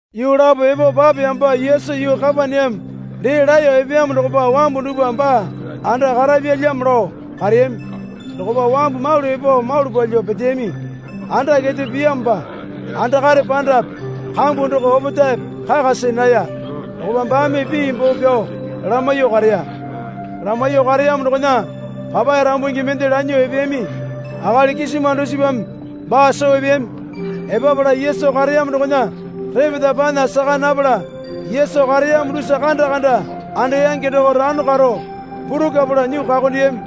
Yuu lapo epo papeyamopa Yesu yuu Kapaneame dee laeyo epeyamo dokopa wambu dupwa baa anda karapyalyamo lao kareyami. Dokopa wambu malu epo malu palyuo peteyami. Anda kete piyamopa andakare pandape kambu doko opetaepe kaka see naya. Dokopa baame pii boo pyao lamaiyuo kareya. Lamaiyuo kareyamo dokona papae rambungi mende lanyuo epeyami. Akali kisima dusipame baa soo epeyami. Epapala Yesu kareyamo dokona repeta panya saka napala Yesu kareyamo dusa kanda kanda andeyange doko rano karo purukwapala nyuo kakondeyami.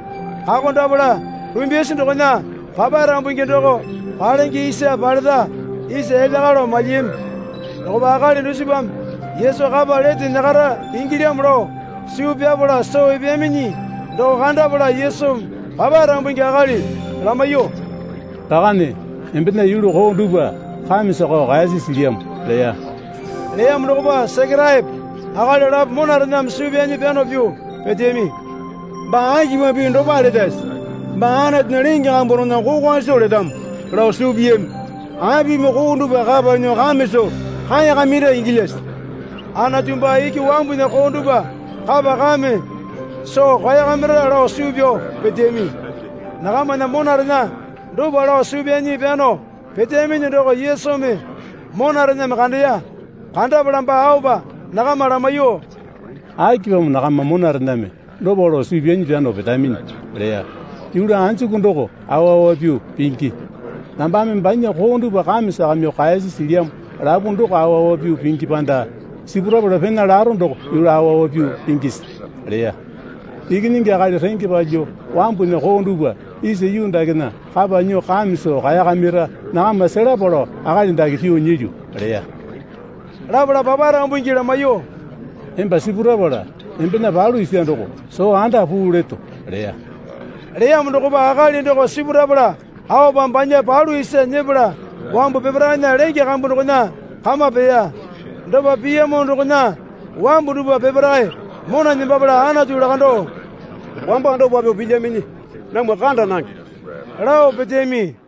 Kakondapala rumbyasi dokona papae rambungi doko palenge isa paleta isa elya kalo malyiyami. Dokopa akali dusipame Yesu kapa lete nyakara ingilyamo lao suu pyapala soo epeyaminyi doko kandapala Yesumi papae rambungi akali lamaiyuo, Rakane, embena yulu koo dupwa kame sakao kaeyasi silyamo leya. Leyamo dokopa Sekeraepo akali lapo monarename suu pyanyi pyano pyuo peteyami. Baa akipamo pii dopale letase? Baa Anatunya lenge kambu dokona kokwa soo letamo, lao suu piyami. Apimi koo dupwa kapa nyuo kame soo kaeyakamira ingilyase? Anatu baa iki wambunya koo dupwa kapa kame soo kaeyakamira, lao suu pyao peteyami. Nakamana monarena dopa lao suu pyanyi pyano peteyaminyi doko Yesumi monarename kandeya. Kandapala baa aopa nakama lamaiyuo, Akipamo nakama monarename dopa lao suu pyanyi pyano petaminyi? leya. Yulu anjuku doko awa awa pyuo pingi. Nambame banya koo dupwa kame sakamyuo kaeyasi silyamo lapu doko awa awa pyuo pingi panda sipurapala pena laro doko yulu awa awa pyuo pingisi? leya. Ikinyingi Akali renge palyuo wambunya koo dupwa isa yuu dakena kapa nyuo kame soo kaeyakamira nakama selapa lao akali dake pyuo nyilyu, leya. Lapala papae rambungi lamaiyuo, Emba sipurapala embena palu isa doko soo anda puu leto, leya. Leyamo dokopa akali doko sipurapala aopa banya palu isa nyepala wambu peparaena lenge kambu dokona kama peya. Dopa piyamo dokona wambu dupwa peparae mona nembapala Anatu lakandao, Wamba dopa pyuo pilyaminyi namwa kanda nange, lao peteyami.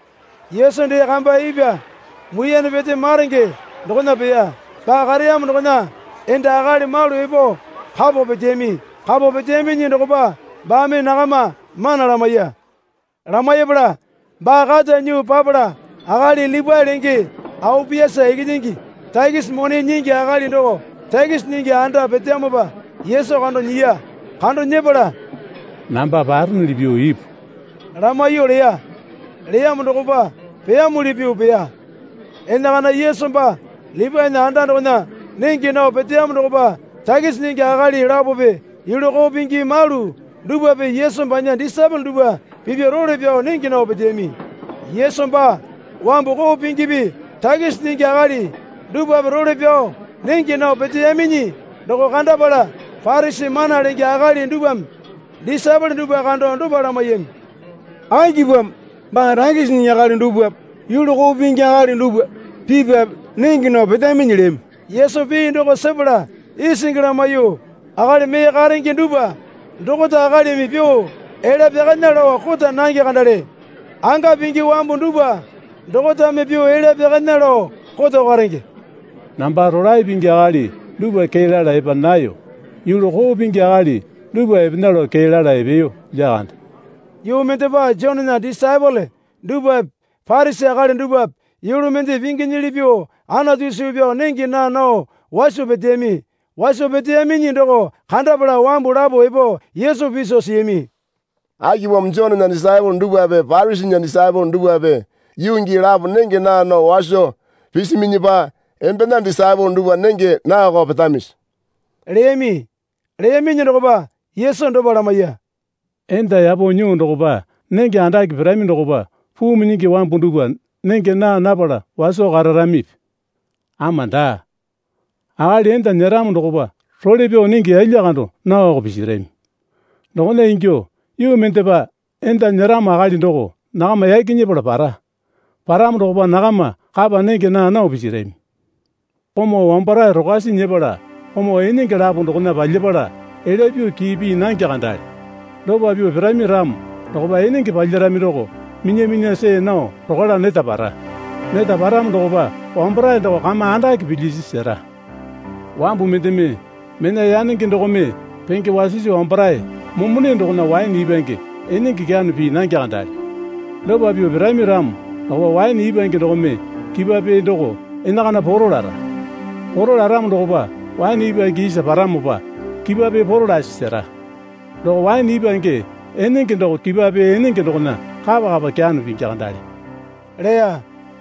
Yesu dee kamba ipwa muiyane pete maronge dokona peya. Baa kareyamo dokona enda akali malu epo kapo peteyami. Kapo peteyaminyi dokopa baame nakama mana lamaiya. Lamaipala baa kata nyuo papala akali Lipae lenge Aopiasa ikinyingi takisi mone nyingi akali doko takisi nyingi anda peteyamopa Yesu kando nyiya. Kando nyepala, Namba paronuli pyuo ipu, lamaiyuo leya. Leyamo dokopa peyamuli pyuo peya. Enakana Yesu baa Lipaena anda dokona nenge nao peteyamo dokopa takisi nyingi akali lapope yulu koo pingi malu dupwape Yesu banya disaepole dupwa pipya role pyao nenge nao peteyami. Yesu baa wambu koo pingipi takisi nyingi akali dupwape role pyao nenge nao peteyaminyi doko kandapala Parisi mana lenge akali dupwame disaepole dupwa kando dopa lamaiyami. Akipamo baa takisi nyingi akali dupwape yulu koo pingi akali dupwa pipwape nenge nao petaminyi? leyami. Yesu pii doko sepala isingi lamaiyuo, Akali mee karenge dupwa dokota akalimi pyuo elya pyakana lao kota nange kandale. Anga pingi wambu dupwa dokotame pyuo elya pyakana lao koto karenge. Namba rolae pingi akali dupwa kee lala epa nayo. Yulu koo pingi akali dupwa epena lao kee lao epeyo lyakande. Yuu mendepa Jonena disaepole dupwape Parisi akali dupwape yulu mende pinginyili pyuo Anatu suu pyao nenge naa nao waso peteyami. Waso peteyaminyi doko kandapala wambu lapo epo Yesu piso siyami. Akipamo Jonena disaepole dupwape Parisinya disaepole dupwape yuu gii lapo nenge naa nao waso pisiminyipa embena disaepole dupwa nenge naoko petamisi? leyami. Leyaminyi dokopa Yesu dopa lamaiya. Enda yapo nyuo dokopa nenge andake pirami dokopa puu minyingi wambu dupwa nenge naa napala waso kararamipi? Ama daa. Akali enda nyeramo dokopa role pyao nenge yalya kando naoko pisirami. Dokona ingyuo yuu mendepa enda nyeramo akali doko nakama yaki nyepala para. Paramo dokopa nakama kapa nenge naa nao pisirami. Komau wambarae rokwasi nyepala komau enenge lapo dokona palyapala elya pyuo kii pii nange kandale. Dopa pyuo pirami ramo dokopa enenge palyarami doko minya minya see nao rokwala neta para. Neta paramo dokopa wambarae doko kama andake pilyisi sera. Wambu mendeme mena yanenge dokome penge wasisi wambarae momone dokona waene ipwange enenge kyano pii nange kandale. Dopa pyuo pirami ramo dokopa waene ipwange dokome kipwa pee doko enakana poro lara. Poro laramo dokopa waene ipwange isa paramopa, kipwa pee poro lasi sera. Doko waene ipwange enenge doko kipwa pee enenge dokona kapa kapa kyano pingi kandale, leya.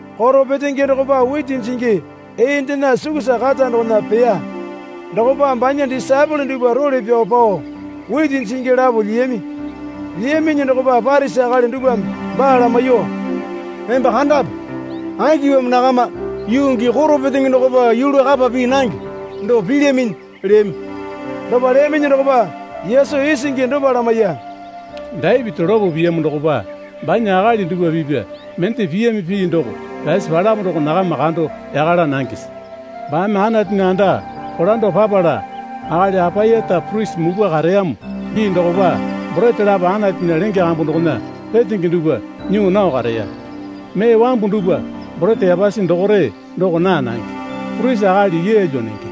Koro petenge dokopa witi jingi eendena sukusa kata dokona peya. Dokopa banya disaepole dupwa role pyao pao witi jingi lapo lyiyami. Lyiyaminyi dokopa Parisi akali dupwame baa lamaiyuo, Emba kandape. Akipamo nakama yuu gii koro petenge dokopa yulu kapa pii nange doko pilyaminyi? leyami. Dopa leyaminyi dokopa Yesu isingi dopa lamaiya. Dapiti lopo piyamo dokopa banya akali dupwa pipya mende piyami pii doko pyasi palamo doko nakama kando yaka laa nangese? Baame Anatunya anda kolando papala akali Apayata purisi mupwa kareyamo gii dokopa borete lapo Anatunya lenge kambu dokona retenge dupwa nyuo nao kareya. Mee wambu dupwa, borete yapasi dokore doko naa nange, purisi akali yeelyo nenge.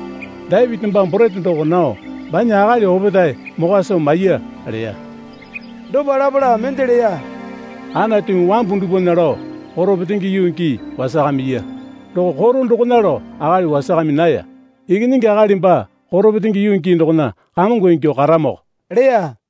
Dapiti baa borete doko nao, banya akali opetae mokwa soo maiya, leya. Dopa lapala mende leya. Anatumi wambu dupwana lao koro petenge yuu gii wasakamaiya. Doko koro dokona lao akali wasakami naya. Ikinyingi Akali baa koro petenge yuu gii dokona kamongo ingyuo karamoko, leya.